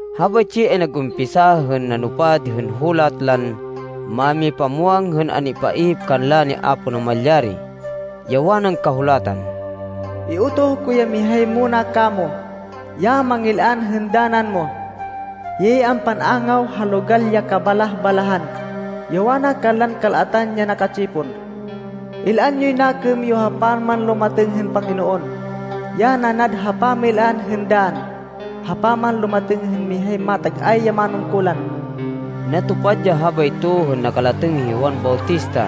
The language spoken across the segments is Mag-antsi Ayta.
Habaytsi ay nag-umpisa hên nanupad hên hulat lan mámipamwang hên an-ipaihip kanla ni Apo Namalyari, ya wanan Kahulatan, “Iutoh ko ya mihay muna kamo, ya mangil-an hên danan mo. Hiyay ampan-angaw ha logal ya kabalah-balahan, ya wana kanlan kal-atan ya naka-tsipon, ‘Il-an yoy nakêm yo ha pamanlumatêng hên Panginoon, Ya nanad ha pamil-an hên dann ha pamanlumatêng hên mihay matag-ay ya manungkulan.’” Natupad ya habayto hên nakalatêng hi Juan Bautista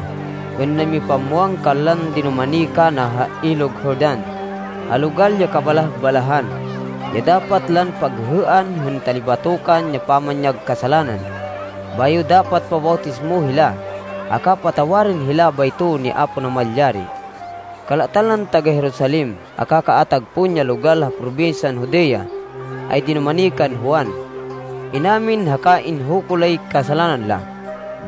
hên namipamwang kanlan dinumani kana ha Ilog Jordan, ha logal ya kabalah-balahan, ya dapat lan paghêhêan hên talibatokan ya pamanyag kasalanan, bayo dapat pabawtismo hila, haka patawarên hila bayto ni Apo Namalyari. Kal-atan lan taga-Jerusalem, haka kaatag pon ya logal ha probinsyan Judea, ay dinumani kan Juan. Inamin haka inhuko lay kasalanan la,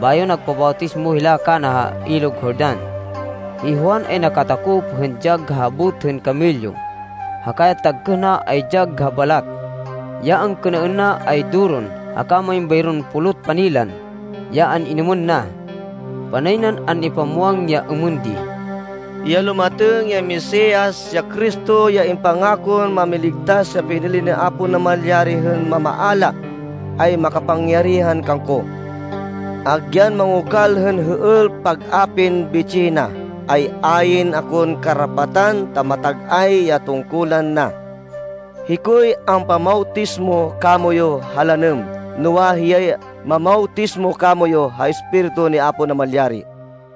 bayo nagpabawtismo hila kana ha Ilog Jordan. Hi Juan ay nakatakop hên dyag ha habot hên kamelyo, haka ya tagkêh na ay dyag ha balat. Ya angkênaên na ay doron haka main bayron pulot panilan ya an-inêmên na. Panay nan an-ipamwang ya êmên di, “Ya lumatêng ya Mesias, ya Cristo, ya impangakon Mámiligtas ya pinili ni Apo Namalyari hên mamaala, ay makapangyarihan kangko. Agyan mangokal hên hêêl pag-apin bitsih na, ay ayn akon karapatan ta matag-ay ya tungkulan na. Hikoy ampamawtismo kamoyu ha lanêm, noa, hiyay mamawtismo kamoyu ha Espiritu ni Apo Namalyari.”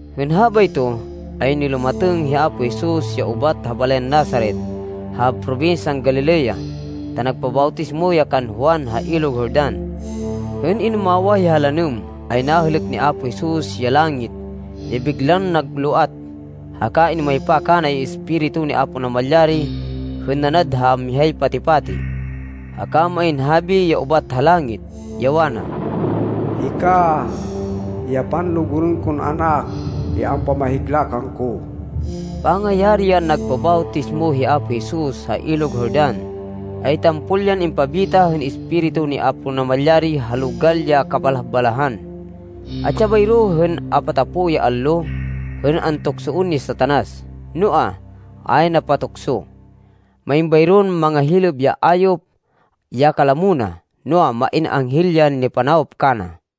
Hên habayto, ay nilumatêng hi Apo Jesus, ya ubat ha balayan Nazaret ha probinsyan Galilea, ta nagpabawtismo ya kan Juan ha Ilog Jordan. Hên inumawah ya ha lanêm, ay nahêlêk ni Apo Jesus ya langit ya biglan nagloat, haka inumaypa kana ya Espiritu ni Apo Namalyari hên nanad ha mihay pati-pati. Haka main habi ya ubat ha langit, ya wana, “Hika ya panlugurên kon Anak ya ampamahigla kangko.” Pangayari yan nagpabawtismo hi Apo Jesus, ha Ilog Jordan, ay tampol yan impabita hên Espiritu ni Apo Namalyari ha logal ya kabalah-balahan. Atsi ya bayro hên apatapo ya allo, hên antuksoên ni Satanas, noa, a ya napatukso. Main bayron mangahilêb ya ayop ya kalamo na, noa, main anghel ya nipanawop kana.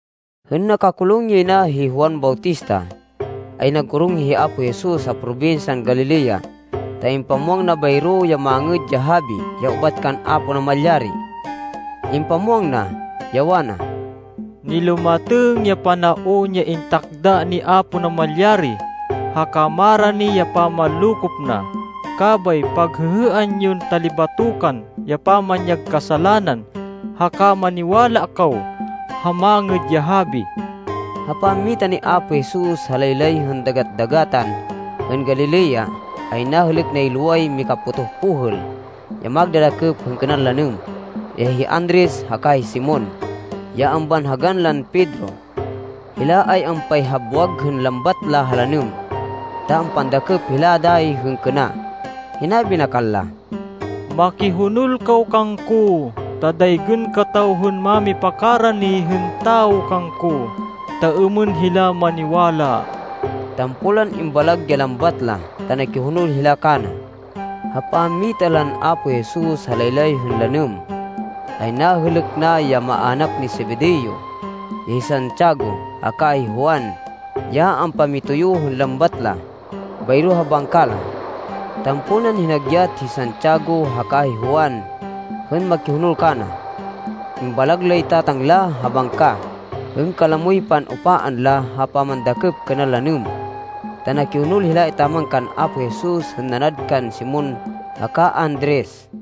Hên nakakulung yay na hi Juan Bautista, ay nag-orong hi Apo Jesus ha probinsyan Galilea, ta impamwang na bayro ya Mangêd ya Habi ya ubat kan Apo Namalyari. Impamwang na, ya wana, “Nilumatêng ya panaon ya intakda ni Apo Namalyari, haka marani ya pamanlokop na, kabay paghêhêan yon talibatokan ya pamanyag kasalanan, haka maniwala kaw ha Mangêd ya Habi!” Ha pammita ni Apo Jesus ha laylay hên Dagat-dagatan hên Galilea, ay nahêlêk nay loway mikapotoh pohêl, ya magdadakêp hên kênan lanêm, ya hi Andres haka hi Simon, ya ambanhagan lan Pedro. Hila ay ampayhabwag hên lambat ha lanêm, ta ampandakêp hila dayi hên kêna. Hinabi na kanla, “Makihonol kaw kangko, ta daygên kataw hên mámipakarani hên tawo kangko, ta êmên hila maniwala.” Tampol lan imbalag ya lambat la, ta nakihonol hila kana. Ha pammita lan Apo Jesus ha laylay hên lanêm, ay nahêlêk na ya maának ni Zebedeo, ya hi Santiago haka hi Juan ya ampamitoyo hên lambat la, bayro ha bangka la. Tampol nan hinagyat hi Santiago haka hi Juan hên makihonol kana. Imbalag lay tatang la ha bangka hên kalamoy pan-upaan la ha pamandakêp kênan lanêm, ta nakihonol hila etaman kan Apo Jesus hên nanad kan Simon haka Andres.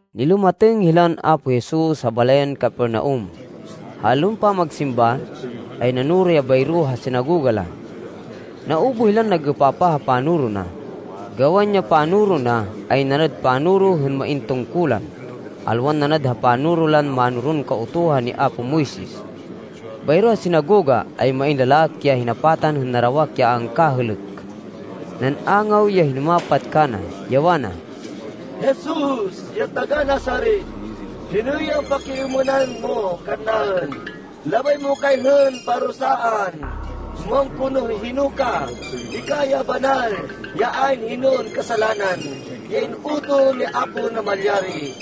Nilumatêng hilan Apo Jesus ha balayan Capernaum. Ha allon pamagsimba, ay nanoro ya bayro ha sinagoga la. Naubuh hilan nag-êpapah ha panoro na, gawan ya panoro na, ay nanad panoro hên main tungkulan, alwan nanad ha panoro lan mánoron Kautuhan ni apo Moises. Bayro ha sinagoga, ay main lalaki ya hinapatan hên narawak ya a angkahêlêk. Nan-angaw ya hinumapat kana, ya wana, “Jesus ya taga-Nazaret, hinoy ampakiêmênan mo kannaên? Labay mo kay hên parusaan? Muwang ko no hino ka. Hika ya banal, ya ayn hinon kasalanan, ya in-utoh ni Apo Namalyari.”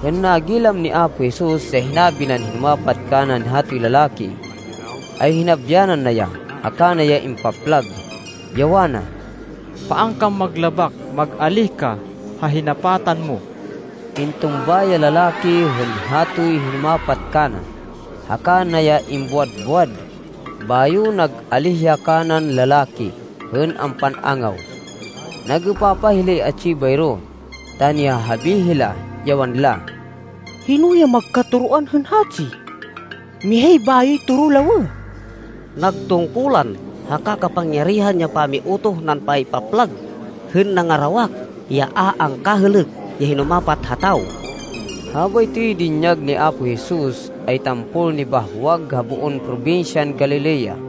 Hên nagilam ni Apo Jesus ya hinabi nan hinumapat kanan hatoy lalaki, ay hinabyanan na ya, haka na ya impaplag, ya wana, “Paan kan maglabak! Mag-alíh ka ha hinapatan mo!” Intumba ya lalaki hên hatoy hinumapat kana, haka na ya imbuwad-buwad, bayo nag-alíh ya kanan lalaki hên ampan-angaw. Nag-êpapah hilay atsi bayro, ta nihahabi hila, ya wanla, “Hino ya magkatoroan hên hatsi? Mihay bayoy toro lawêh! Nag tungkulan haka kapangyarihan ya pami-utoh nan paypaplag hên nangarawak ya a angkahêlêk ya hinumapat ha tawo.” Habaytoy dinyag ni Apo Jesus, ay tampol nibahwag ha boon probinsyan Galilea.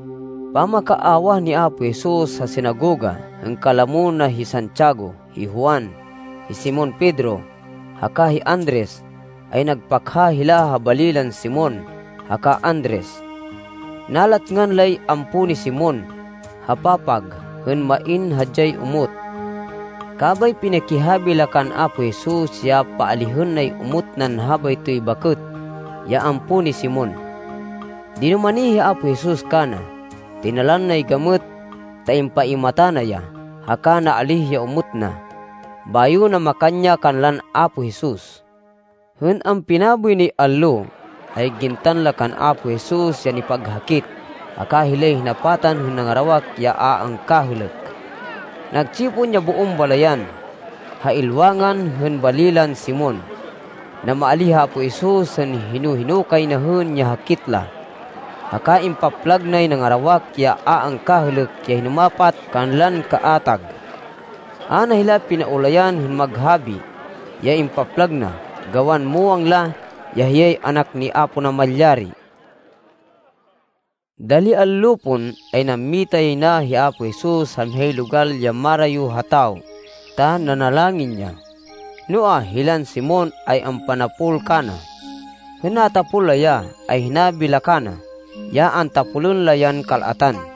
Pamakaawah ni Apo Jesus ha sinagoga, hên kalamo na hi Santiago, hi Juan, hi Simon Pedro haka hi Andres, ay nagpakha hila ha bali lan Simon haka Andres. Nalatngan lay ampo ni Simon, ha papag, hên main hadyay omot. Kabay pinikihabi la kan Apo Jesus ya paalihên nay omot nan habaytoy bakêt, ya ampo ni Simon. Dinumani hi Apo Jesus kana, tinalan nay gamêt, ta impaimata na ya, haka naalíh ya omot na. Bayo namakan ya kanlan Apo Jesus. Hên ampinaboy nay allo, ay gintan la kan Apo Jesus ya nipaghakit, haka hilay hinapatan hên nangarawak ya a angkahêlêk. Nagtsipon ya boon balayan, ha ilwangan hên bali lan Simon. Namaalíh hi Apo Jesus hên hino-hino kay na hên ya hakit la, haka impaplag nay nangarawak ya a angkahêlêk ya hinumapat kanlan kaatag. A na hila pinaulayan hên maghabi, ya impaplag na, gawan muwang la, ya hiyay Anak ni Apo Namalyari. Dali allo pon, ay nammita yay na hi Apo Jesus ha mihay logal ya marayo ha tawo, ta nanalangin ya. Noa, hilan Simon ay ampanapol kana. Hên natapol la ya, ay hinabi la kana, ya antapolên la yan kal-atan.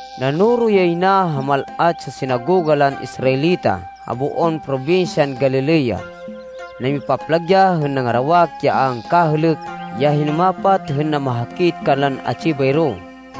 Nanoro yay na ha mal-at ya sinagoga lan Israelita ha boon probinsyan Galilea. Namipaplag ya hên nangarawak ya a angkahêlêk ya hinumapat hên namahakit kanlan atsi bayro.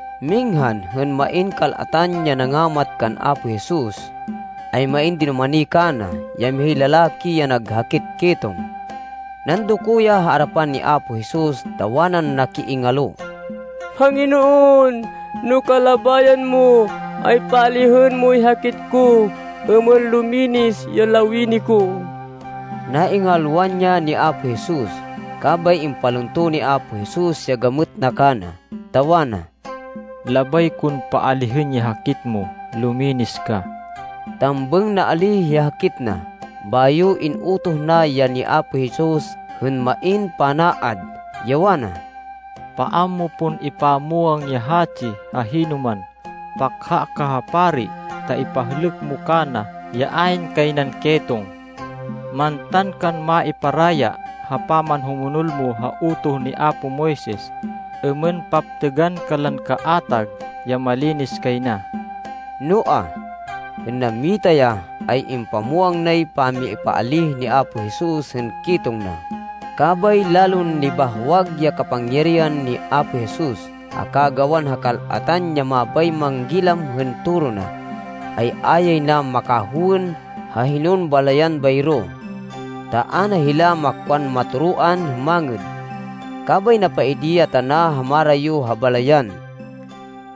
Minghan hên main kal-atan ya nangamat kan Apo Jesus, ay main dinumani kana, ya mihay lalaki ya nag hakit ketong. Nandoko ya ha arapan ni Apo Jesus, ta wanan nakiingalo, “Panginoon, no kalabayan mo, ay paalihên moy hakit ko, êmên luminis ya lawini ko.” Naingalwan ya ni Apo Jesus, kabay impalunto ni Apo Jesus ya gamêt na kana, ta wana, “Labay kon paalihên ya hakit mo. Luminis ka!” Tambêng naalíh ya hakit na. Bayo in-utoh na ya ni Apo Jesus hên main panaad, ya wana, “Paan mo pon ipamwang ya hatsi ha hinoman. Pakha ka ha pari ta ipahlêk mo kana ya ayn kay nan ketong. Mantan kan maiparaya ha pamanhumonol mo ha utoh ni apo Moises, êmên paptêgan kanlan kaatag ya malinis kay na.” Noa, hên nammita ya, ay impamwang nay pamipaalíh ni Apo Jesus hên ketong na, kabay lalon nibahwag ya kapangyarihan ni Apo Jesus, haka gawan ha kal-atan ya mabay manggilam hên toro na, ay a yay na makahowên ha hinon balayan bayro, ta a na hila makwan matoroan hên mangêd. Kabay napaidi ya tana ha marayo ha balayan,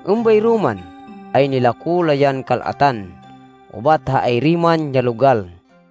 êmbayro man, ay nilako la yan kal-atan ubat ha ayri man ya logal.